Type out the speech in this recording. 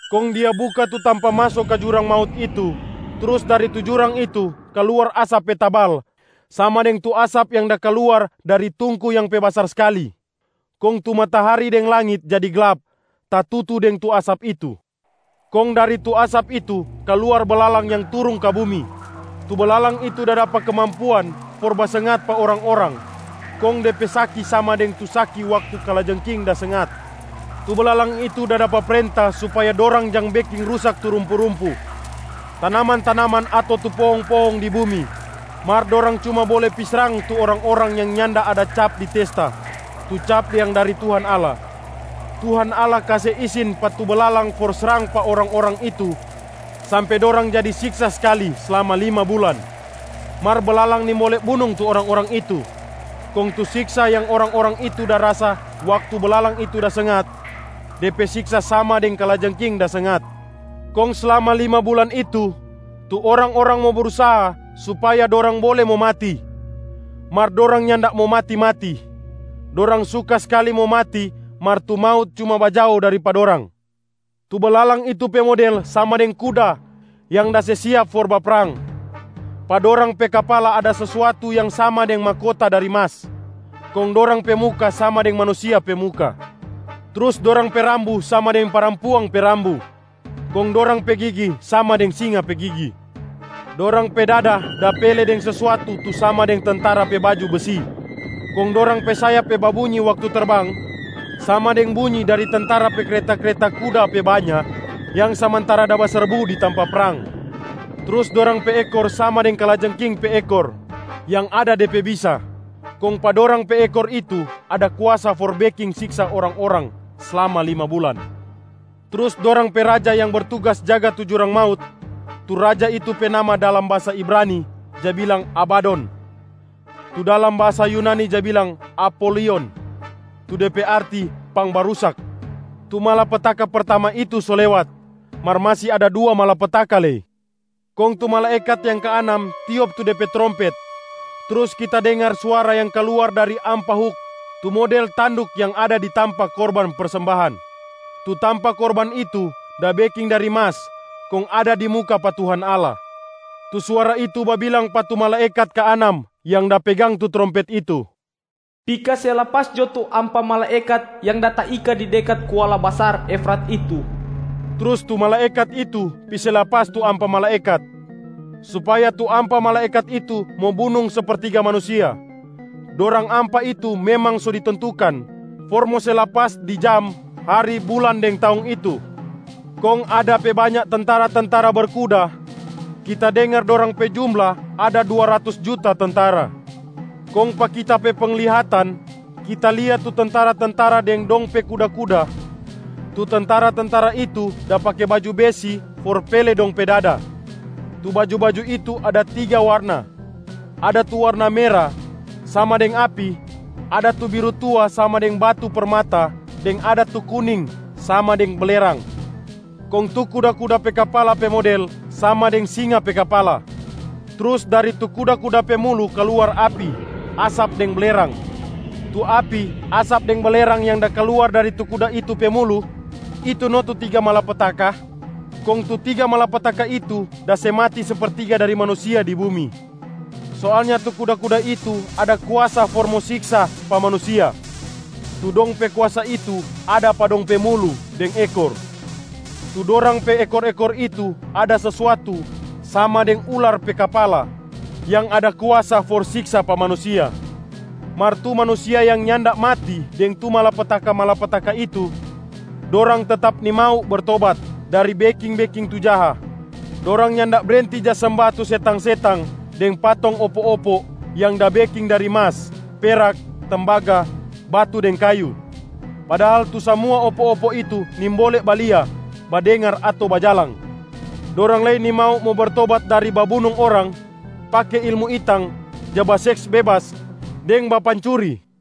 Kong dia buka tu tampa maso ka jurang maut itu, trus dari tu jurang itu kaluar asap pe tabal sama deng tu asap yang da kaluar dari tungku yang pe basar skali. Kong tu matahari deng langit jadi glap tatutu deng tu asap itu. Kong dari tu asap itu kaluar belalang yang turung ka bumi. Tu belalang itu da dapa kemampuan for basengat pa orang-orang, kong de pe saki sama deng tu saki waktu kalajengking da sengat. Tu belalang itu da dapa prenta supaya dorang jang beking rusak tu rumpu-rumpu, tanaman-tanaman ato tu pohong-pohong di bumi, mar dorang cuma bole pi srang tu orang-orang yang nyanda ada cap di testa, tu cap yang dari Tuhan Allah. Tuhan Allah kase isin pa tu belalang for srang pa orang-orang itu sampe dorang jadi siksa skali slama lima bulan, mar belalang nimbole bunung tu orang-orang itu. Kong tu siksa yang orang-orang itu da rasa waktu belalang itu da sengat, de pe siksa sama deng kalajengking da sengat. Kong slama lima bulan itu, tu orang-orang mo brusaha supaya dorang bole mo mati, mar dorang nyanda mo mati-mati. Dorang suka skali mo mati mar tu maut cuma bajao dari pa dorang. Tu belalang itu pe model sama deng kuda yang da se siap for baprang. Pa dorang pe kapala ada sesuatu yang sama deng mahkota dari mas, kong dorang pe muka sama deng manusia pe muka. Trus dorang pe rambu sama deng parampuang pe rambu, kong dorang pe gigi sama deng singa pe gigi. Dorang pe dada da pele deng sesuatu tu sama deng tentara pe baju besi. Kong dorang pe sayap pe babunyi waktu terbang sama deng bunyi dari tentara pe kreta-kreta kuda pe banya yang samantara da baserbu di tampa prang. Trus dorang pe ekor sama deng kalajengking pe ekor yang ada de pe bisa. Kong pa dorang pe ekor itu ada kuasa for beking siksa orang-orang slama lima bulan. Trus dorang pe raja yang bertugas jaga tu jurang maut. Tu raja itu pe nama dalam bahasa Ibrani ja bilang Abadon, tu dalam bahasa Yunani ja bilang Apolion tu de pe arti pangbarusak. Tu malapetaka pertama itu so lewat, mar masi ada dua malapetaka lei. Kong tu malaekat yang kaanam tiop tu de pe trompet, trus kita dengar suara yang kaluar dari ampa huk tu model tanduk yang ada di tampa korban persembahan. Tu tampa korban itu da beking dari mas kong ada di muka pa Tuhan Allah. Tu suara itu babilang pa tu malaekat kaanam yang da pegang tu trompet itu, “Pi kase lapas jo tu ampa malaekat yang da taika di dekat kuala basar Efrat itu!” Trus tu malaekat itu pi se lapas tu ampa malaekat, supaya tu ampa malaekat itu mo bunung sepertiga manusia. Dorang ampa itu memang so ditentukan for mo se lapas di jam, hari, bulan deng taong itu. Kong ada pe banya tentara-tentara berkuda, kita dengar dorang pe jumla ada dua ratus juta tentara. Kong pa kita pe penglihatan, kita lia tu tentara-tentara deng dong pe kuda-kuda. Tu tentara-tentara itu da pake baju besi for pele dong pe dada. Tu baju-baju itu ada tiga warna: ada tu warna mera sama deng api, ada tu biru tua sama deng batu permata deng ada tu kuning sama deng belerang. Kong tu kuda-kuda pe kapala pe model sama deng singa pe kapala, trus dari tu kuda-kuda pe mulu kaluar api, asap deng belerang. Tu api, asap deng belerang yang da kaluar dari tu kuda itu pe mulu, itu no tu tiga malapetaka. Kong tu tiga malapetaka itu da se mati sepertiga dari manusia di bumi. Soalnya tu kuda-kuda itu ada kuasa for mo siksa pa manusia, tu dong pe kuasa itu ada pa dong pe mulu deng ekor. Tu dorang pe ekor-ekor itu ada sesuatu sama deng ular pe kapala yang ada kuasa for siksa pa manusia. Mar tu manusia yang nyanda mati deng tu malapetaka-malapetaka itu, dorang tetap nimau bertobat dari beking-beking tu jaha. Dorang nyanda brenti ja semba tu setang-setang deng patong opo-opo yang da beking dari mas, perak, tembaga, batu deng kayu, padahal tu samua opo-opo itu nimbole balia, badengar ato bajalang. Dorang lei nimau mo bertobat dari babunung orang, pake ilmu itang, ja baseks bebas deng bapancuri.